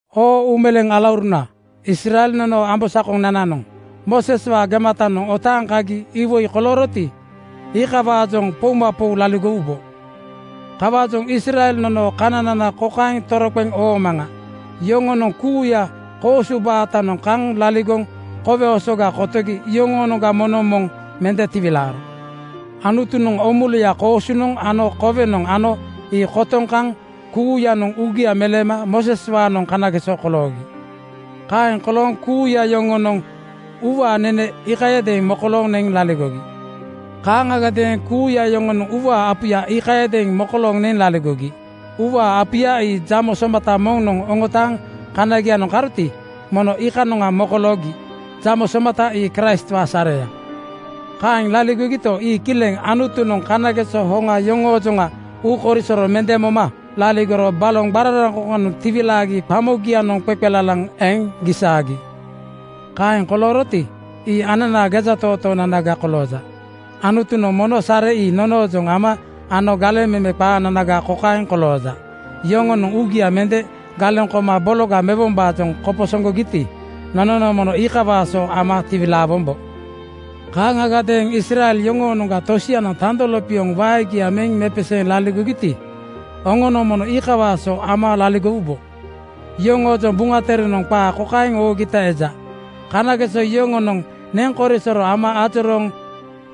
Oo uumeleeŋ alauruna, Israel nonoo ambosakonananoŋ Mooseswaa gematanoŋ otaaŋ kagi iwoi kolooroti, iika-waajoŋ poumapou laligowubo. Kawaajoŋ Israel nonoo kananana kokaeŋ toroqeŋ oomaŋa: Yoŋonoŋ kuuya koosu baatanoŋ kaŋ laligoŋ Kowe Osoga kotogi yoŋoonoŋga moŋnoŋ moŋ mende tiwilaaro. Anutunoŋ oomuluya koosunoŋ ano kowenoŋ ano ii kotoŋ kaŋ kuuyanoŋ uugia meleema Mooseswaanoŋ kanageso koloogi. Kaeŋ kolooŋ kuuya yoŋonoŋ uuwaa nene iikayadeeŋ mokolooŋ neŋ laligogi. Kaaŋagadeeŋ kuuya yoŋonoŋ uuwaa apuya iikayadeeŋ mokolooŋ neŋ laligogi. Uuwaa apuya ii jamo somata moŋnoŋ oŋotaaŋ kanagianoŋ karoti, mono iikanoŋa mokoloogi. Jamo somata ii Kraistwaa sareya. Kaeŋ laligogito, ii kileŋ Anutunoŋ kanageso hoŋa yoŋoojoŋa uukorisoro mende moma laligoro baloŋ qararaŋkoŋkoŋanoŋ tiwilaagi qamogianoŋ qeqelalaŋ eŋ gisaagi. Kaeŋ kolooroti, ii ananaa gejatootoonanaga kolooja. Anutunoŋ mono sare ii nonoojoŋ ama ano galeŋ meme qaananaga kokaeŋ kolooja: Yoŋonoŋ uugia mende galeŋ koma bologa mewombaajoŋ koposoŋgogiti, nononoŋ mono iikawaa so ama tiwilaawombo. Kaaŋagadeeŋ Israel yoŋoonoŋga tosianoŋ tando lopioŋ waegia meŋ mepeseeŋ laligogiti, oŋonoŋ mono iikawaa so ama laligowubo. Yoŋoojoŋ Buŋa Terenoŋ qaa kokaeŋ oogita eja, “Kanageso yoŋonoŋ neŋ korisoro ama ajorooŋ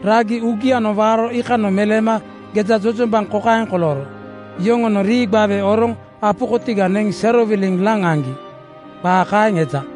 ragi uugianoŋ waaro iikanoŋ meleema gejajojombaŋ kokaeŋ kolooro: Yoŋonoŋ rii gbawe oroŋ apu kotiga neŋ serowiliŋ laŋ aŋgi.” Qaa kaeŋ eja.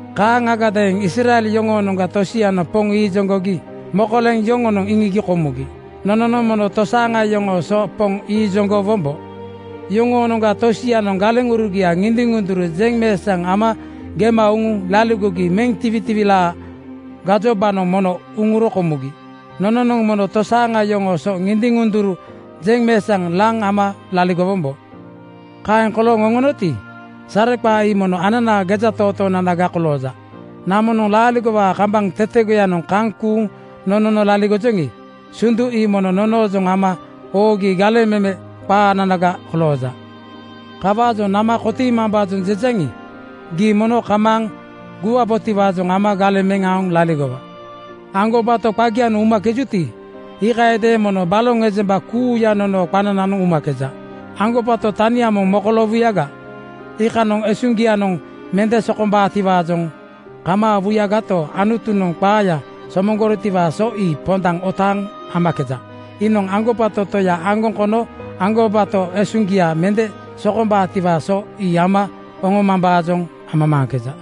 Kaaŋagadeeŋ Israel yoŋoonoŋga tosianoŋ Poŋ iijoŋgogi mokoleŋ yoŋonoŋ iŋigi komugi. Nononoŋ mono tosaaŋa yoŋoo so Poŋ iijoŋgo wombo. Yoŋoonoŋga tosianoŋ galeŋurugia ŋindiŋ-ŋunduru jeŋmeesaŋ ama gema uŋuŋ laligogi meŋ tiwitiwilaa gajobanoŋ mono uŋuro komugi. Nononoŋ mono tosaaŋa yoŋoo so ŋindiŋ-ŋunduru jeŋmeesaŋ laŋ ama laligowombo. Kaeŋ kolooŋ oŋonoti, sareqaa ii mono ananaa gejatootoonanaga kolooja. Namonoŋ laaligowaa kambaŋ tetegoyanoŋ kaŋ kuuŋ nonono laligojoŋi, sundu ii mono nonoojoŋ ama oogi galeŋ meme qaananaga kolooja. Kawaajoŋ nama kotiimambaajoŋ jejaŋi, gii mono kamaaŋ guwabotiwaajoŋ ama galeŋ meŋ aoŋ laligowa. Aŋgobato qagianoŋ umakejuti, iikayadeeŋ mono baloŋ ejemba kuuya nonoo qanananoŋ umakeju. Aŋgobato tania moŋ mokoloowuyaga, iikanoŋ esuŋgianoŋ mende sokombaatiwaajoŋ kamaawuyagato, Anutunoŋ qaaya somoŋgorotiwaa so ii pondaŋ otaaŋ amakeja. Iinoŋ aŋgobato Toya aŋgoŋ kono aŋgobato esuŋgia mende sokombaatiwaa so ii ama oŋomambaajoŋ amamaaŋkeja.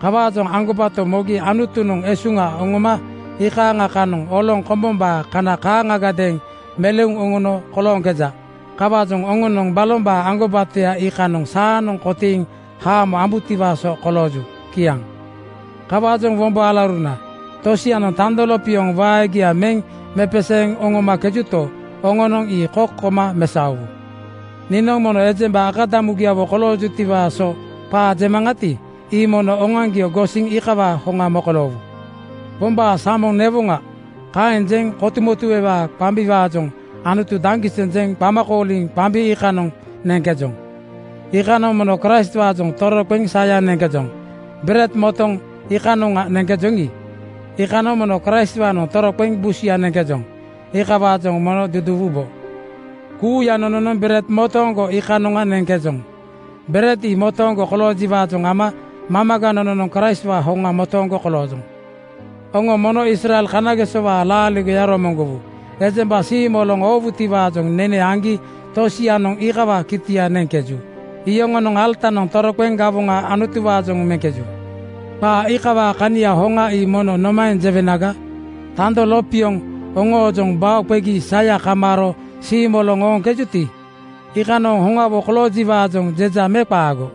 Kawaajoŋ aŋgobato mogi Anutunoŋ esuŋa oŋoma iikaaŋa kanoŋ oloŋ kombombaa kana kaaŋagadeeŋ meleuŋ oŋono kolooŋkeja. Kawaajoŋ oŋonoŋ balombaa aŋgobatoya iikanoŋ saanoŋ kotiiŋ haamo ambutiwaa so kolooju. Kiaŋ. Kawaajoŋ wombo alauruna, tosianoŋ tando lopioŋ waegia meŋ mepeseeŋ oŋomakejuto, oŋonoŋ ii kok koma mesaowu. Niinoŋ momo ejemba akadamugiawo koloojutiwaa so qaa jemaŋati, ii mono oŋoaŋgio gosiŋ iikawaa hoŋa mokoloowu. “Pombaanoŋ samoŋ newoŋa,” kaeŋ jeŋ kotumotuewaa qambiwaajoŋ Anutu daŋgiseŋ jeŋ qama kooliŋ qambi iikanoŋa neŋkejoŋi, iikanoŋ mono Kraistwaanoŋ toroqeŋ saya neŋkejoŋ. Bered motoŋ iikanoŋa neŋkejoŋi, iikanoŋ mono Kraistwaanoŋ toroqeŋ busuya neŋkejoŋ. Iikawaajoŋ mono duduuwubo. Kuuya nononoŋ bered motooŋgo iikanoŋa neŋkejoŋ. Bered ii motooŋgo koloojiwaajoŋ ama mamaga nononoŋ Kraistwaa hoŋa motooŋgo koloojoŋ. Oŋo mono Israel kanagesowaa laaligoya romoŋgowu. Ejemba siimoloŋ oowutiwaajoŋ nene aŋgi tosianoŋ iikawaa kitia neŋkejuti, iyoŋonoŋ alatanoŋ toroqeŋ gawoŋa Anutuwaajoŋ meŋkeju. Qaa iikawaa kania hoŋa ii mono nomaeŋ jewenaga? Tando lopioŋ oŋoojoŋ bao qegi saya kamaaro siimoloŋ ooŋkejuti, iikanoŋ hoŋawo koloojiwaajoŋ jeja me qaago?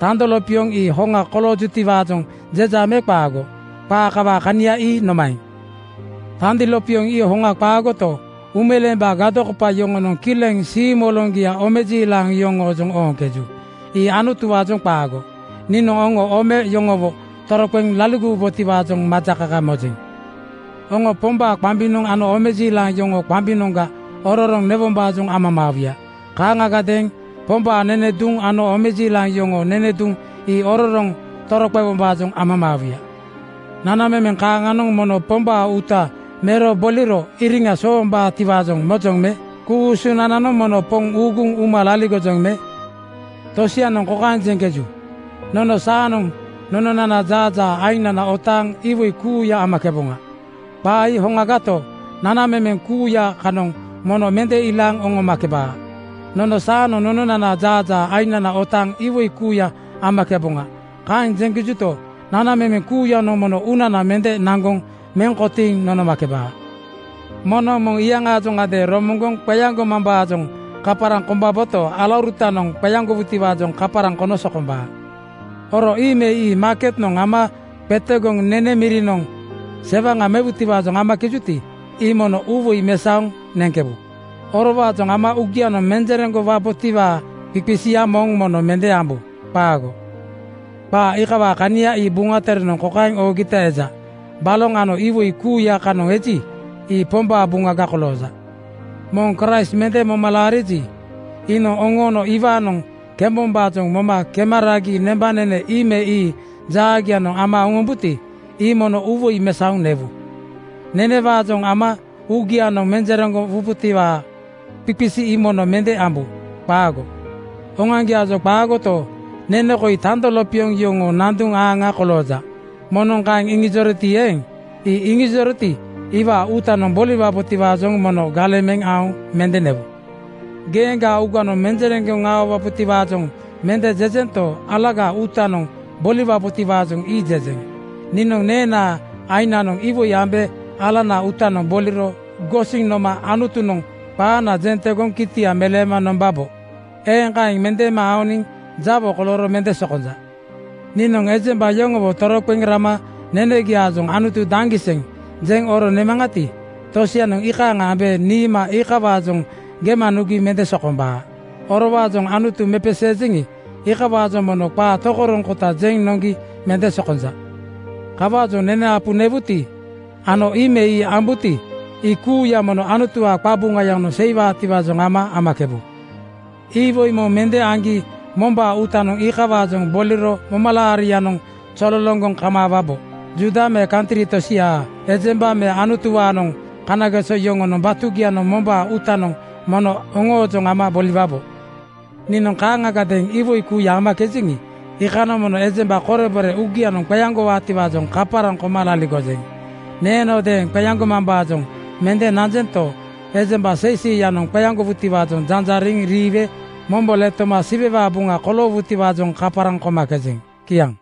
Tando lopioŋ ii hoŋa koloojutiwaajoŋ jeja me qaago? Qaa kawaa kania ii nomaeŋ? Tando lopioŋ ii hoŋa qaagoto, uumeleembaa gadokopa yoŋonoŋ kileŋ siimoloŋgia omejiilaŋ yoŋoojoŋ ooŋkeju. Ii Anutuwaajoŋ qaago. Niinoŋ oŋo ome yoŋowo toroqeŋ laligowubotiwaajoŋ majakaka mojeŋ. Oŋo Pombaa qambinoŋga ano omejiilaŋ yoŋoo qambinoŋga ororoŋ newombaajoŋ amamaawuya. Kaaŋagadeeŋ Pombaa nene duŋ ano omejiilaŋ yoŋoonoŋ nene duŋ ii ororoŋ toroqewombaajoŋ amamaawuya. Nanamemeŋ kaaŋanoŋ mono Pombaa uuta mero boliro iriŋa soombaatiwaajoŋ mojoŋ me? Ku-usunananoŋ mono Poŋ uuguŋ uma laligojoŋ me? Tosianoŋ kokaeŋ jeŋkeju, “Nono saanoŋ nononana jaajaa ainana otaaŋ iwoi kuuya amakeboŋa.” Qaa ii hoŋagato, nanamemeŋ kuuya kanoŋ mono mende ilaaŋ nonomakebaa. “Nono saanoŋ nononana jaajaa ainana otaaŋ iwoi kuuya amakeboŋa,” kaeŋ jeŋkejuto, nanamemeŋ kuuyanoŋ mono uunana mende naŋgoŋ meŋ kotiiŋ nonomakebaa. Moŋnoŋ moŋ iyaŋaajoŋadeeŋ romoŋgoŋ qeaŋgomambaajoŋ kaparaŋ kombaboto, alaurutanoŋ qeaŋgowutiwaajoŋ kaparaŋ kono sokombaa. Oro ii me ii maaketnoŋ ama qetegoŋ nene mirinoŋ (sii mirinoŋ) sewaŋa mewutiwaajoŋ amakejuti, ii mono uuwoi mesaoŋ neŋkebu. Orowaajoŋ ama uugianoŋ menjereŋgowabotiwaa qisiqisia moŋ mono mende ambu. Qaago! Qaa iikawaa kania ii Buŋa Terenoŋ kokaeŋ oogita eja, “Baloŋ ano iwoi kuuya kanoŋ eji, ii Pombaa buŋaga kolooja.” Moŋ Kraist mende moma laariji, iinoŋ oŋoono iwaanoŋ kembombaajoŋ moma kema ragi nembanene ii me ii jaagianoŋ ama oŋombuti, ii mono uuwoi mesaoŋ newu. Nenewaajoŋ ama uugianoŋ menjereŋgowabotiwaa qisiqisia ii mono mende ambu. Qaago! Oŋoaŋgiaajoŋ qaagoto, “Nene koi tando lopioŋ yoŋoo nanduŋ aaŋa kolooja,” moŋnoŋ kaeŋ iŋijoroti eeŋ, ii iŋijoroti, iwaa uutanoŋ boliwabotiwaajoŋ mono galeŋ meŋ aoŋ mende newu. Geeŋgaa uuganoŋ menjereŋgowabotiwaajoŋ mende jejento, alagaa uutanoŋ boliwabotiwaajoŋ ii jejeŋ. Niinoŋ neenaa aiŋnoŋ iwoi ambe alanaa uutanoŋ boliro gosiŋ noma Anutunoŋ qaana jeŋ tegoŋ kitia meleema nombabo. Eeŋ kaeŋ mendeema aoniŋ jawo kolooro mende sokonja. Niinoŋ ejemba yoŋowo toroqeŋ rama nenegiaajoŋ “Anutu daŋgiseŋ!” jeŋ oro nemaŋati, tosianoŋ iikaaŋ ambe niima iikawaajoŋ gema nugi mende sokombaa. Orowaajoŋ Anutu mepeseejeŋi, iikawaajoŋ mono qaa tokoroŋkota jeŋ noŋgi mende sokonja. Kawaajoŋ nene apu newuti, ano ii me ii ambuti, ii kuuya mono Anutuwaa qabuŋayanoŋ seiwaatiwaajoŋ ama amakebu. Iwoi moŋ mende aŋgi mombaa uutanoŋ iikawaajoŋ boliro momalaarianoŋ zololoŋgoŋ kamaawabo. Juuda me kantri tosiaa ejemba me Anutuwaanoŋ kanageso yoŋoo batugianoŋ mombaa uutanoŋ mono oŋoojoŋ ama boliwabo. Niinoŋ kaaŋagadeeŋ iwoi kuuya amakejeŋi, iikanoŋ mono ejemba korebore uugianoŋ qeaŋgowaatiwaajoŋ kaparaŋ koma laligojeŋ. Neenodeeŋ qeaŋgomambaajoŋ mende nanjento, ejemba seiseiyanoŋ qeaŋgowutiwaajoŋ janjariŋ riiwe mombo letoma Siwewaa buŋa koloowutiwaajoŋ kaparaŋ komakejeŋ. Kiaŋ.